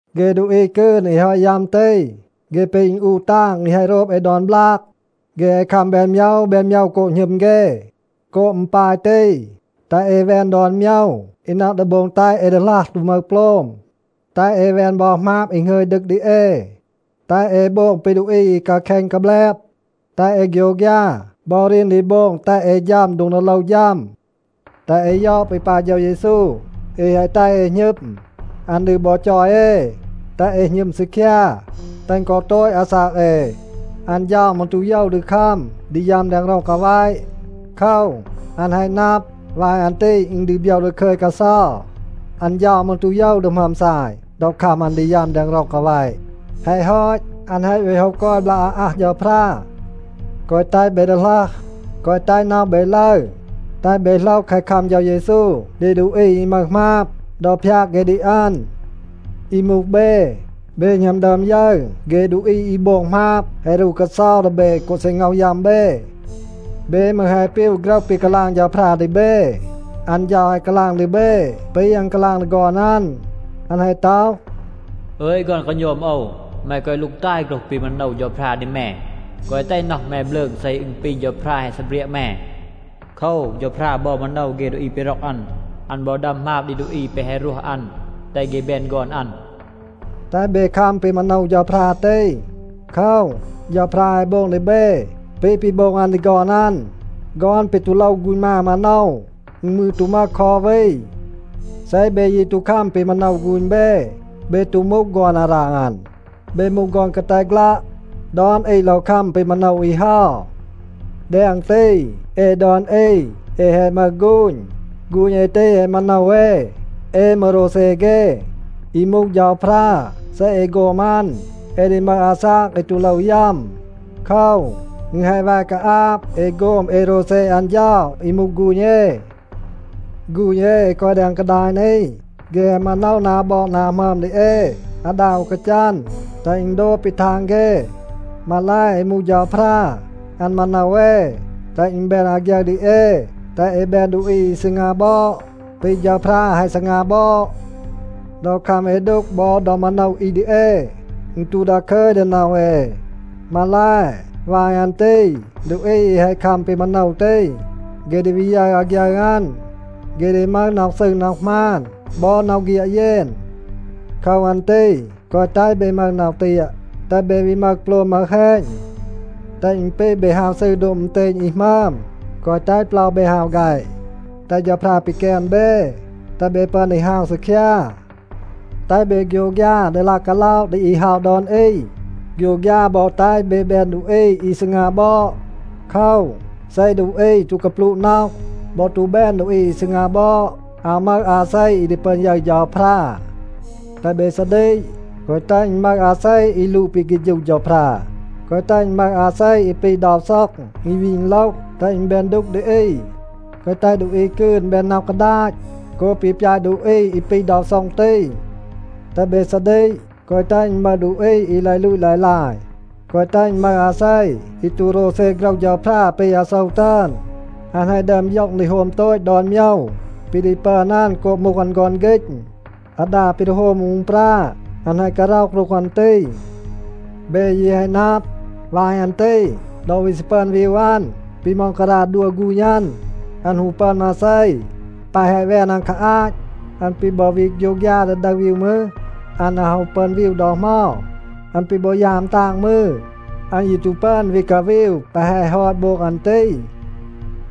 เฆ ดูอี กืน อี แฮะ ฮอต ยัม ตี, เฆ ปี อึณอูะ ตาง อี แฮะ โรบ เอ ดอน บลาก. เฆ แฮะ คัม แบน โมยว แบน โมยว โกบ หณึม เฆ. โกบ อึณ ปาย ตี, แตห เอ แวน ดอน โมยว อี นับ ดี โบง แตห เอ ดีหลัห ตู มึห โปลม. แตห เอ แวน บอ หมาบ อี หงึย ดึก ดี เอ. แตห เอ โบง ปี ดูอี อี กาแคณ กาแบลบ. แตห เอ โฆยวฆยา บอ รีน ดี โบง แตห เอ ฌัม โดง ดี โลว ฌัม. แตห เอ ยอด ปี ปาย เฌา เยซู อี แฮะ แตห เอ หณึม. อัน ดี บอ จอย เอ, แตห เอ หณึม ซีคยา, แตห กอ โตต อาซาก เอ. อัน เฌา มืร ตู โยว ดี คัม ดี ยัม แดง ร็อง กาแวะ. โคว, อัน แฮะ นับ, วาย อัน ตี อึณ ดี โบยว ดาคึย กาเซา. อัน เฌา มืร ตู โยว ดี หมึอม ซาย ดอ คัม อัน ดี ยัม แดง ร็อง กาแวะ. แฮะ ฮอต, อัน แฮะ วี โฮะ กอย บลาก อาอัห เฌาพรา. แกวะ แตห เบ ดีหลัห. แกวะ แตห น็อห เบ ลึร. แตห เบ โหลห แคะ คัม เฌา เยซู ดี ดูอี อี มึห หมาบ, ดอ พยาก เฆ ดี อัน. อี มูห เบ, เบ หณัม ดึอม ยึร เฆ ดูอี อี โบง หมาบ แฮะ รู กาเซา ดี เบ กอ ซี ง็อห ยัม เบ. เบ มืร แฮะ ปีว โฆรห ปี กาลาง เฌาพรา ดี เบ. อัน เฌา แฮะ กาลาง ดี เบ ปี อัน กาลาง ดี ฆอน อัน. อัน แฮะ ต็อห, “อึย ฆอน กาโณม โอว, แม แกวะ ลูกตาย โฆรห ปี มาโนว เฌาพรา ดี แม. แกวะ แตห น็อห แม บลืง เซ อึณ ปี เฌาพรา แฮะ ซีเบรียะ แม. โคว, เฌาพรา บอ มาโนว เฆ ดูอี ปี ร็อก อัน. อัน บอ ดัม หมาบ ดี ดูอี แปะ แฮะ รวห อัน, แตห เฆ แบน ฆอน อัน.” แตห เบ คัม ปี มาโนว เฌาพรา ตี. โคว, เฌาพรา แฮะ โบง ดี เบ ปี ปี โบง อัน ดี ฆอน อัน. ฆอน ปี ตู โลว ฆูณ มา มาโนว, อึณ มืร ตู มึห คอ อู วี. เซ เบ ยี ตู คัม ปี มาโนว ฆูณ เบ, เบ ตู มูห ฆอน อาราง อัน. เบ มูห ฆอน กาแต ฆลัะ. ดอน อี โลว คัม ปี มาโนว อี เฮา. แดง ตี, เอ ดอน อี, เอ แฮะ มึห ฆูณ. ฆูณ เอ ตี แฮะ มาโนว เอ. เอ มืร โรวเซ เฆ. อี มูห เฌาพรา, เซ เอ โฆม อัน, เอ ดี มึห อาซาก อี ตู โลว ยัม. โคว, อึณ แฮะ แว กาอาบ เอ โฆม เอ โรวเซ อัน เฌา อี มูห ฆูณ เอ. ฆูณ เอ อี กอย แดง กาดาย นี, เฆ แฮะ มาโนว นา บอด นา หมึอม ดี เอ อาดา อู กาจัน, แตห อึณ โดบ ปี ทาง เฆ. มาแล, อี มูห เฌาพรา, อัน มาโนว เอ, แตห อึณ แบน อาฆยึร ดี เอ, แตห เอ แบน ดูอี อี ซีงา บอด ปี เฌาพรา แฮะ ซีงา บอด. ดอ คัม เอ ดูก บอ ดอ มาโนว อี ดี เอ, อึณ ตู ดาคึย ดี น็อห เอ. มาแล, วาย อัน ตี ดูอี อี แฮะ คัม ปี มาโนว ตี, เฆ ดี วี ยึร อาฆยึร อัน. เฆ ดี มึห น็อห ซืร น็อห หมาน บอ น็อห เฆียด เยน. โคว อัน ตี แกวะ แตห เบ มึห น็อห เตียะ, แตห เบ วี มึห โปลม มึห แฮณ. แตห อึณ ปี เบ ฮาว ซืร โดบ อึณเตณ อี หมึอม. แกวะ แตห เปลา เบ ฮาว แฆะ. แตห เฌาพรา ปีแกน เบ, แตห เบ ปึอน ดี ฮาว ซีคยา. แตห เบ โฆยวฆยา ดี ลาย กาล็อะ ดี อี เฮา ดอน อี. โฆยวฆยา บอ แตห เบ แบน ดูอี อี ซีงา บอด. โคว, เซ ดูอี ตู กาปลูะ น็อห บอ ตู แบน ดูอี อี ซีงา บอด, อาว มึห อาเซ อี ดี ปึอน ยึร เฌาพรา. แตห เบ ซาดีก, แกวะ แตห อึณ มึห อาเซ อี ลูด ปี เฆฌู เฌาพรา. แกวะ แตห อึณ มึห อาเซ อี ปี เดา ซ็อง อี วี อึณโลห, แตห อึณ แบน ดูก ดี อี. แกวะ แตห ดูอี กืน แบน น็อห กาดาต โกบ ปี ปยาต ดูอี อี ปี เดา ซ็อง ตี. แตห เบ ซาดีก, แกวะ แตห อึณ มึห ดูอี อี ลาย ลูต ลาย ลาย. แกวะ แตห อึณ มึห อาเซ อี ตู โรวเซ โฆรห เฌาพรา ปี อาโซว ตึอน. อัน แฮะ ดึอม ย็อง ดี โฮม โตต ดอน โมยว ปี ดี ปึอน อัน โกบ มูห อัน ฆอน ฆีณ. อาดา ปี ดี โฮม อู อึณปรา อัน แฮะ การ็อห รูห อัน ตี. เบ ยี แฮะ นับ, วาย อัน ตี ดอ วี ซี ปึอน วีว อัน ปี ม็องการา ดัว ฆูณ อัน, อัน ฮู ปึอน มาเซ. แปะ แฮะ แวน อัน คา อาต อัน ปี บอ วี โฆยวฆยา ดี ดึห วีว มืร, อัน อาว ฮู ปึอน วีว ดอ เหมา. อัน ปี บอ ยาม ตาง มืร, อัน ยี ตู ปึอน วี กาวีว แปะ แฮะ ฮอต โบง อัน ตี.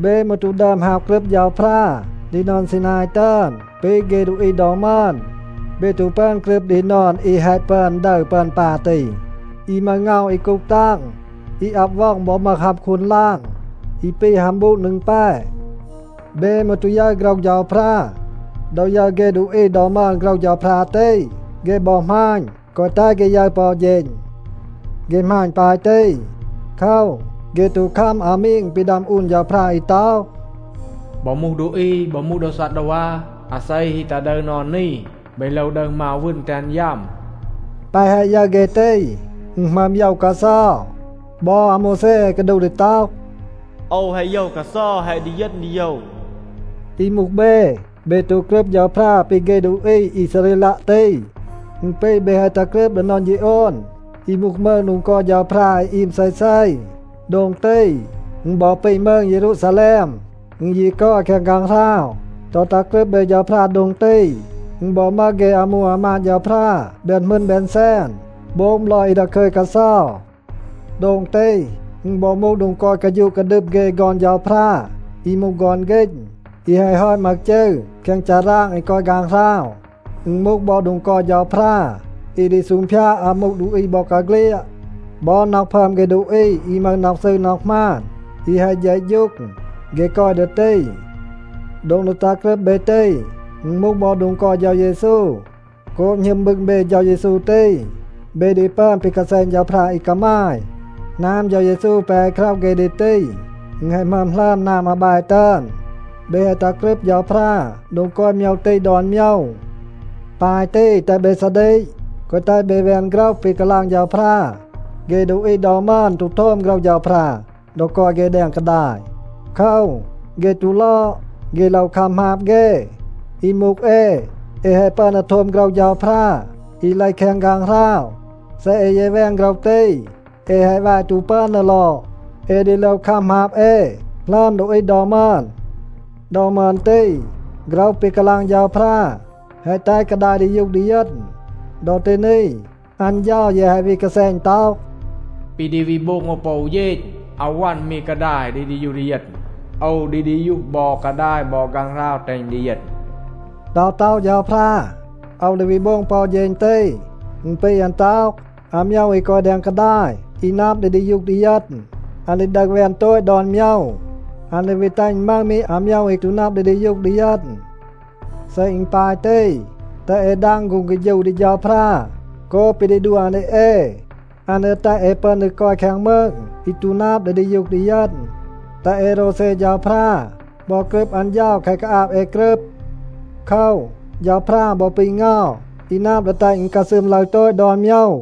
เบ มืร ตู ดึอม ฮาว กรึบ เฌาพรา ดี นอน ซีนาย ตึอน ปี เฆ ดูอี ดอ มึอน. เบ ตู ปึอน กรึบ ดี นอน อี แฮะ ปึอน ดึร ปึอน ปา ตี, อี มึห เงา อี กูห ตาง, อี อับ ว็อง บอ มึห ฮัม คูน ลาง อี ปี ฮัม บูด นึง แป. เบ มืร ตู ยึร โฆรห เฌาพรา. ดอ ยึร เฆ ดูอี ดอ มึอน โฆรห เฌาพรา ตี, เฆ บอ หมาณ, แกวะ แตห เฆ ยึร ปอ อู เฌณ. เฆ หมาณ ปาย ตี โคว, เฆ ตู คัม อามีง ปี ดัม อูน เฌาพรา อี ต็อห, “บอ มูห ดูอี, บอ มูห โดว ซัดดาวา, อาเซ ฮี ตัห ดึร นอน นี, เบ โลว ดึห มาว วึณ, แตห อัน ยัม.” แปะ แฮะ ยึร เฆ ตี, อึณ หมึอม โยว กาเซา. บอ อาโมวแซ แฮะ กาดูห ดี ต็อห, “โอว แฮะ โยว กาเซา, แฮะ ดีเยณ ดีโยว.” อี มูห เบ, เบ ตู กรึบ เฌาพรา ปี เฆ ดูอี อีซาเรลัะ ตี. อึณ ปี เบ แฮะ ตัห กรึบ ดี นอน ฌีโอน, อี มูห มืง โดง กอย เฌาพรา อี อีม เซเซ. โดง ตี, อึณ บอ ปี มืง เยรูซาแลม. อึณ ยี กอย แคง ฆางหราว. ดอ ตัห กรึบ เบ เฌาพรา โดง ตี, อึณ บอ มึห เฆ อามู อามาด เฌาพรา แบน หมึณ แบน แซน, โบง บลอย อี ดาคึย กาเซา. โดง ตี, อึณ บอ มูห โดง กอย กาฌูะ กาดึม เฆ ฆอน เฌาพรา อี มูห ฆอน ฆีณ, อี แฮะ ฮอต มึห จืร แคง ฌาราง อี กอย ฆางหราว. อึณ มูห บอ โดง กอย เฌาพรา อี ดี ซูงพยาด อามู ดูอี บอกาเฆลียด. บอ น็อห พึอม เฆ ดูอี อี มึห น็อห ซืร น็อห หมาน, อี แฮะ เฌะฌูง, เฆ กอย ดี ตี. โดง ดี ตัห กรึบ เบ ตี, อึณ มูห บอ โดง กอย เฌา เยซู. โกบ หณึม บึง เบ เฌา เยซู ตี, เบ ดี ปึอน ปี กาแซณ เฌาพรา อี กามาย. หนาม เฌา เยซู แปะ แฮะ คร็อห เฆ ดี ตี, อึณ แฮะ หมึอม หลึอม หนาม อาแบ ตึอน. เบ แฮะ ตัห กรึบ เฌาพรา โดง กอย โมยว ตี ดอน โมยว. ปาย ตี, แตห เบ ซาดีก, แกวะ แตห เบ แวน โฆรห ปี กาลาง เฌาพรา. เฆ ดูอี ดอ มึอน ตู โทม โฆรห เฌาพรา ดอ กอย เฆ แดง กาดาย. โคว, เฆ ตู ลอด, เฆ โลว คัม หมาบ เฆ. อี มูห เอ, เอ แฮะ ปึอน ดี โทม โฆรห เฌาพรา อี เลห แคง ฆางหราว. เซ เอ ยี แวน โฆรห ตี, เอ แฮะ แว ตู ปึอน ดี ลอด. เอ ดี โลว คัม หมาบ เอ หลึอม ดูอี ดอ มึอน. ดอ มึอน ตี โฆรห ปี กาลาง เฌาพรา แฮะ แตห กาดาย ดียูห ดีเยณ. ดอ ตี นี, อัน เฌา ยี แฮะ วี กาแซณ ต็อห, “ปี ดี วี โบง โอว ปอ อู เฌณ, อาว วัน มี กาดาย ดี ดียูห ดีเยณ, โอว ดี ดียูห บอ กาดาย บอ ฆางหราว แตห อึณ ดีเยณ.” ดอ ต็อห เฌาพรา, “โอว ดี วี โบง ปอ อู เฌณ ตี,” อึณ ปี อัน ต็อห, อาโมยว อี กอย แดง กาดาย อี นับ ดี ดียูห ดีเยณ, อัน ดี ดึห แวน โตต ดอน โมยว. อัน ดี วี แตห อึณ มึห มี อาโมยว อี ตู นับ ดี ดียูห ดีเยณ. เซ อึณ ปาย ตี, แตห เอ ดาง ฆูง เฆฌู ดี เฌาพรา โกบ ปี ดี ดัว อัน ดี เอ. อัน ดี แตห เอ ปึอน ดี กอย แคง มืง อี ตู นับ ดี ดียูห ดีเยณ. แตห เอ โรวเซ เฌาพรา บอ กรึบ อัน เฌา แคะ กาอาบ เอ กรึบ. โคว, เฌาพรา บอ ปี เงา อี นับ ดี แตห อึณ กาซึม ลึร โตต ดอน โมยว.